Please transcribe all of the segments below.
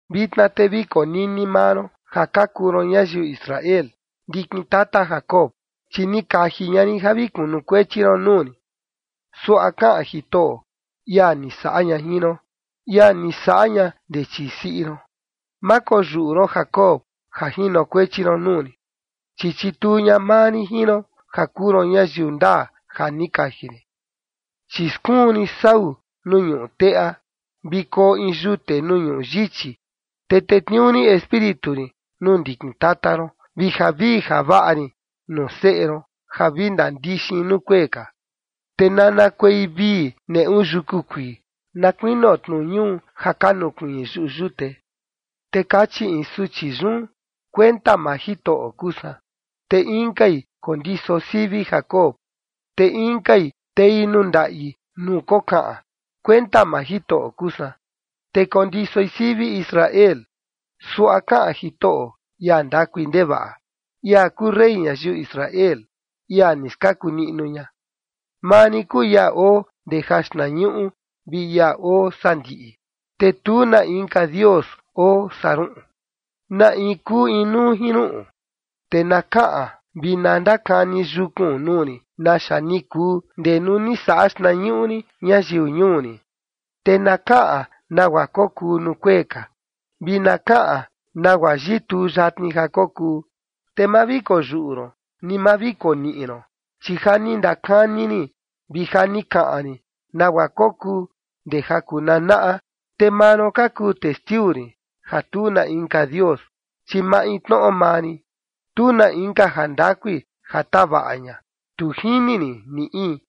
Vitna te vi konini maa ron ja ka kuu ron ñayiu Israel, ndikin tata Jacob, chi ni kaji ña rin ja vi kunukuechi ron nuu rin. Suaꞌa kaꞌan Jitoꞌo, ia ni saꞌa ña jin ron, ia ni saꞌa ña ndee chii siꞌi ron: “Ma koyuꞌu ron Jacob ja jinokuechi ron nuu rin, chi chituu ña maa rin jin ron, ja kuu ron ñayiu ndaa ja ni kaji rin. Chi skuun rin sau nuu ñuꞌu teꞌa, vi koo in yute nuu ñuꞌu yichi, te tetniuu rin Espíritu rin nuu ndikin tata ron, vi javii javaꞌa rin nuu seꞌe ron ja vi ndandixin nuu kuee ka. Te nanakuei vii neꞌu yuku kuii, na kuinio tnu ñuu ja ka nukuiin yuꞌu yute.” Te kachi in suchi yun: “Kuenta maa Jitoꞌo kuu san”, te inkai kondiso sivi Jacob, te inkai tei nuu ndaꞌi nuu kokaꞌan: “Kuenta maa Jitoꞌo kuu san”, te kondisoi sivi Israel. Suaꞌa kaꞌan Jitoꞌo, ia ndakui ndevaꞌa, ia kuu rey ñayiu Israel, ia ni skaku niꞌnu ña: “Maa rin kuu ia oo ndee jaxtnañuꞌu vi ia oo sandiꞌi, te tu na inka dios oo saa ruꞌun. ¿Na in kuu inuu jin ruꞌun? Te na kaꞌan vi na ndakani yukun nuu rin naxa ni kuu ndee nuu ni saꞌa xtnañuꞌu rin ñayiu ñuu rin, te na kaꞌan nagua kokuu nuu kuee ka, vi na kaꞌan nagua yituu yatni ja kokuu. Te ma vi koyuꞌu ron ni ma vi koniꞌi ron, chi ja ni ndakani rin vi ja ni kaꞌan rin nagua kokuu ndee ja kunanaꞌa. Te maa ron ka kuu testiu rin, ja tu na inka dios, chi maintnoꞌo maa rin. Tu na inka jandakui ja tavaꞌa ña, tu jini rin ni in.”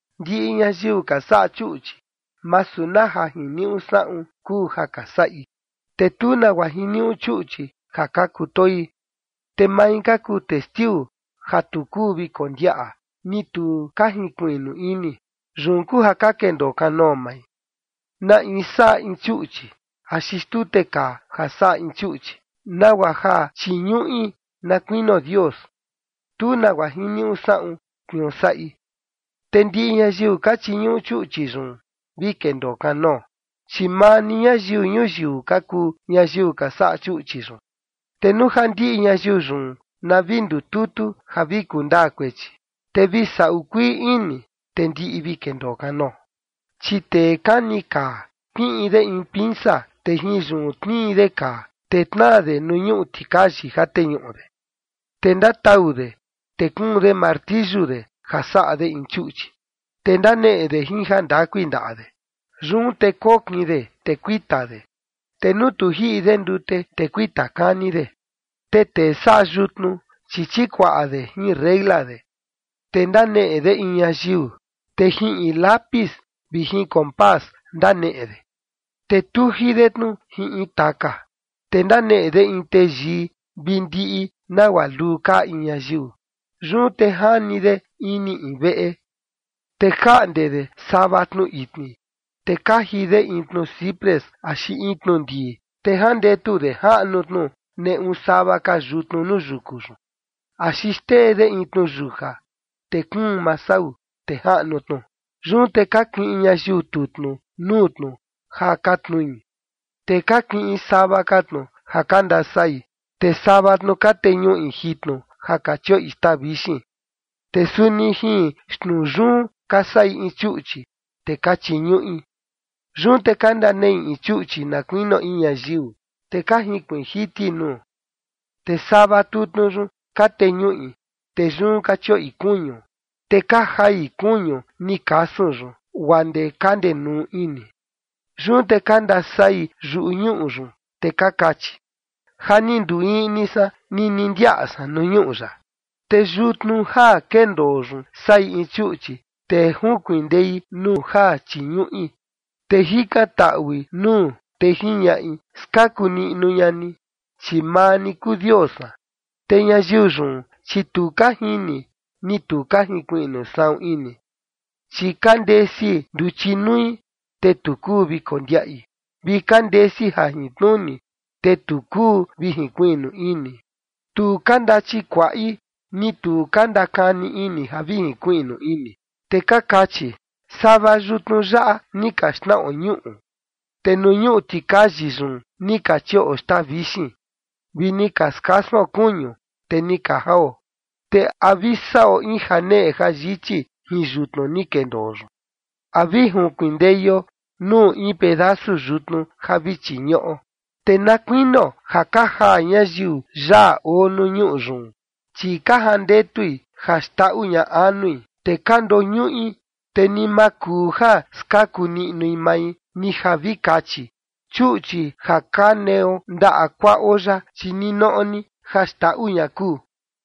Ndiꞌi ñayiu ka saꞌa chuꞌchi, masu na ja jiniuꞌu saꞌun kuu ja ka saꞌi, te tu nagua jiniuꞌu chuꞌchi ja ka kutoi. Te mai ka kuu testiu ja tu kuu vi kondiaꞌa, ni tu ka jinkuiꞌnu ini. Yun kuu ja ka kendoo kanoo mai. Na in saꞌa in chuꞌchi axi xtute kaa ja saꞌa in chuꞌchi, nagua ja chiñuꞌi na kuinio Dios, tu nagua jiniuꞌu saꞌun tniuu saꞌi. Te ndiꞌi ñayiu ka chiñuꞌu chuꞌchi yun, vi kendoo kanoo, chi maa ni ñayiu ñuyiu ka kuu ñayiu ka saꞌa chuꞌchi yun. Te nuu ja ndiꞌi ñayiu yun na vi ndututu ja vi kundaa kuechi, te vi saꞌu kuii ini, te ndiꞌi vi kendoo kanoo. Chi tee kani kaa kiꞌin de in pinsa, te jin yun tnii de kaa, te tnaa de nuu ñuꞌu tikayi ja teñuꞌu de. Te ndatau de, te kuun de martiyu de ja saꞌa de in chuꞌchi, te ndaneꞌe de jin jandakui ndaꞌa de. Yun te kokin de, te kuita de, te nuu tu jiꞌi de ndute, te kuita kani de. Te tee saꞌa yutnu, chi chikuaꞌa de jin reila de, te ndaneꞌe de in ñayiu, te jin in lápiz vi jin compás ndaneꞌe de, te tuji de tnu jin in taka, te ndaneꞌe de in teyii vi ndiꞌi nagua luu kaa in ñayiu. Yun te jani de ini in veꞌe. Te jaꞌnde de sava tnu itni, te kaji de in tnu ciprés axi in tnu ndii, te jandetu de jaꞌnu tnu neꞌu sava ka yutnu nuu yuku yun, axi xtee de in tnuyuja, te kuun maa sau, te jaꞌnu tnu. Yun te ka kiꞌin ñayiu tutnu nuu tnu ja ka tnui, te ka kiꞌin sava tnu ja ka ndasai, te sava tnu ka teñuꞌi jitnu ja ka chioꞌi xtaa vixin. Te suni jin xtnuu yun ka saꞌi in chuꞌchi, te ka chiñuꞌi. Yun te ka ndaneꞌi in chuꞌchi na kuinio in ñayiu, te ka jinkuiin jiti nuu. Te sava tutnu yun, ka teñuꞌi, te yun ka chioꞌi kuñu, te ka jai kuñu ni kasun yun guaa ndee ka ndenuu ini. Yun te ka ndasai yuꞌu ñuꞌu yun, te ka kachi: “Ja ni nduu iꞌni san nini ndiaꞌa san nuu ñuꞌu yaꞌa”. Te yutnu ja kendoo yun saꞌi in chuꞌchi, te junkindei nuu ja chiñuꞌi, te jikantaꞌui nuu, te jiñaꞌi: “Skaku niꞌnu ña ni, chi maa ni kuu dios san”. Te ñayiu yun, chi tu ka jini, ni tu ka jinkuiꞌnu saꞌun ini, chi ka ndesi nduchi nui, te tu kuu vi kondiaꞌi. Vi ka ndesi jajintnuni, te tu kuu vi jinkuiꞌnu ini. Tu ka ndachikuaꞌi, ni tu ka ndakani ini ja vi jinkuiꞌnu ini, te ka kachi: “Sava yutnu yaꞌa ni ka xnaꞌo ñuꞌu, te nuu ñuꞌu tikayi yun ni ka chioꞌo xtaa vixin, vi ni ka skasuon kuñu, te ni ka jao, ¿te a vi saꞌo in janeꞌe jayichi jin yutnu ni kendoo yun? ¿A vi junkindeio nuu in pedasu yutnu ni ja vi chiñuꞌo?” Te na kuinio ja ka jaa ñayiu yaa oo nuu ñuꞌu yun, chi ka jandetui ja xndaꞌu ña anui, te ka ndoñuꞌi, te ni ma kuu ja skaku niꞌnui mai, ni ja vi kachi: “Chuꞌchi ja ka neo ndaꞌa kuaꞌo yaꞌa, chi ninoꞌo ni ja xndaꞌu ña kuu”.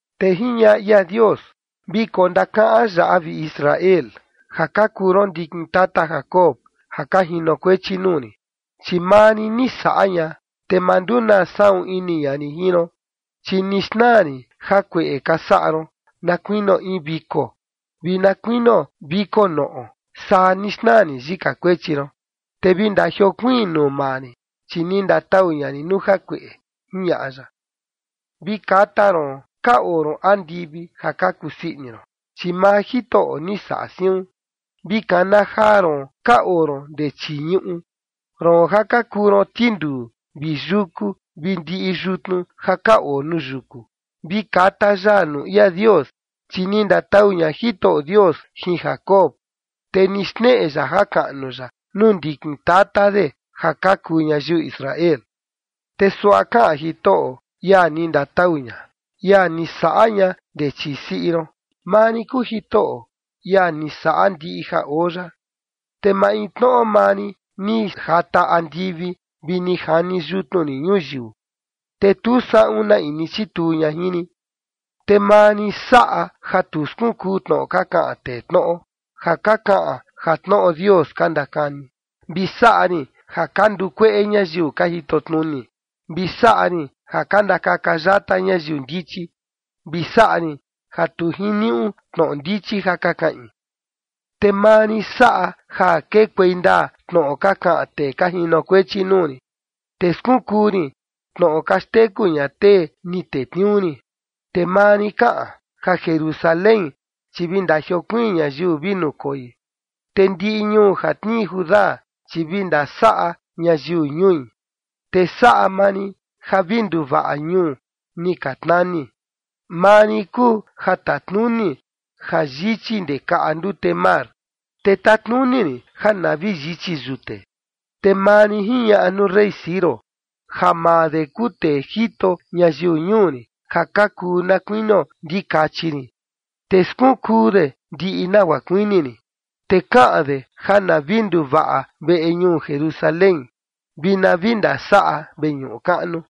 Te jiñaꞌa ia Dios: “Vi kondakaꞌan yaꞌa, vi Israel, ja ka kuu ron ndikin tata Jacob, ja ka jinokuechi nuu rin, chi maa rin ni saꞌa ña, te ma ndunaa saꞌun ini ña rin jin ron. Chi ni xnaa rin jakueꞌe ka saꞌa ron na kuinio in viko vi na kuinio viko noꞌo, saa ni xnaa rin yika kuechi ron. Te vi ndajiokuiin nuu maa rin, chi ni ndatau ña rin nuu jakueꞌe”, jiñaꞌa ya. Vi kata ron ka oo ron andivi ja ka kusii ini ron, chi maa Jitoꞌo ni saꞌa siun. Vi kana jaa ron ka oo ron ndee chii ñuꞌu, roon ja ka kuu ron tinduu vi yuku vi ndiꞌi yutnu ja ka oo nuu yuku. Vi kata yaa nuu ia Dios, chi ni ndatau ña Jitoꞌo Dios jin Jacob, te ni xneꞌe ya jakaꞌnu ya nuu ndikin tata de ja ka kuu ñayiu Israel. Te suaꞌa kaꞌan Jitoꞌo, ia ni ndatau ña, ia ni saꞌa ña ndee chii siꞌi ron: “Maa rin kuu Jitoꞌo, ia ni saꞌa ndiꞌi ja oo yaꞌa, te maintnoꞌo maa rin ni jata andivi vi ni jani yutnu rin ñuyiu, te tu saꞌun na in ni chituu ña jin rin. Te maa rin saꞌa ja tu skunkuu tnoꞌo ka kaꞌan tee tnoꞌo, ja ka kaꞌan ja tnoꞌo Dios ka ndakani, vi saꞌa rin ja ka ndukueꞌe ñayiu ka jitotnuni, vi saꞌa rin ja ka ndakaka yata ñayiu ndichi, vi saꞌa rin ja tu jiniuꞌu tnoꞌo ndichi ja ka kaꞌin. Te maa rin saꞌa ja kekuei ndaa tnoꞌo ka kaꞌan tee ka jinokuechi nuu rin, te skunkuu rin tnoꞌo ka xteku ña tee ni tetniuu rin. Te maa rin kaꞌan: Ja Jerusalén, chi vi ndajiokuiin ñayiu vi nukoi, te ndiꞌi ñuu ja tnii Judá, chi vi ndasaꞌa ñayiu ñui, te saꞌa maa rin ja vi nduvaꞌa ñuu ni ka tnani. Maa rin kuu ja tatnuni ja yichi ndee kaꞌa ndute mar, te tatnuni rin ja na vi yichi yute. Te maa rin jiñaꞌa nuu rey Ciro ja maa de kuu tee jito ñayiu ñuu rin ja ka kuu na kuinio ndikachi rin. Te skunkuu de ndiꞌi nagua kuini rin, te kaꞌan de ja na vi nduvaꞌa veꞌe ñuu Jerusalén, vi na vi ndasaꞌa veñuꞌu kaꞌnu.”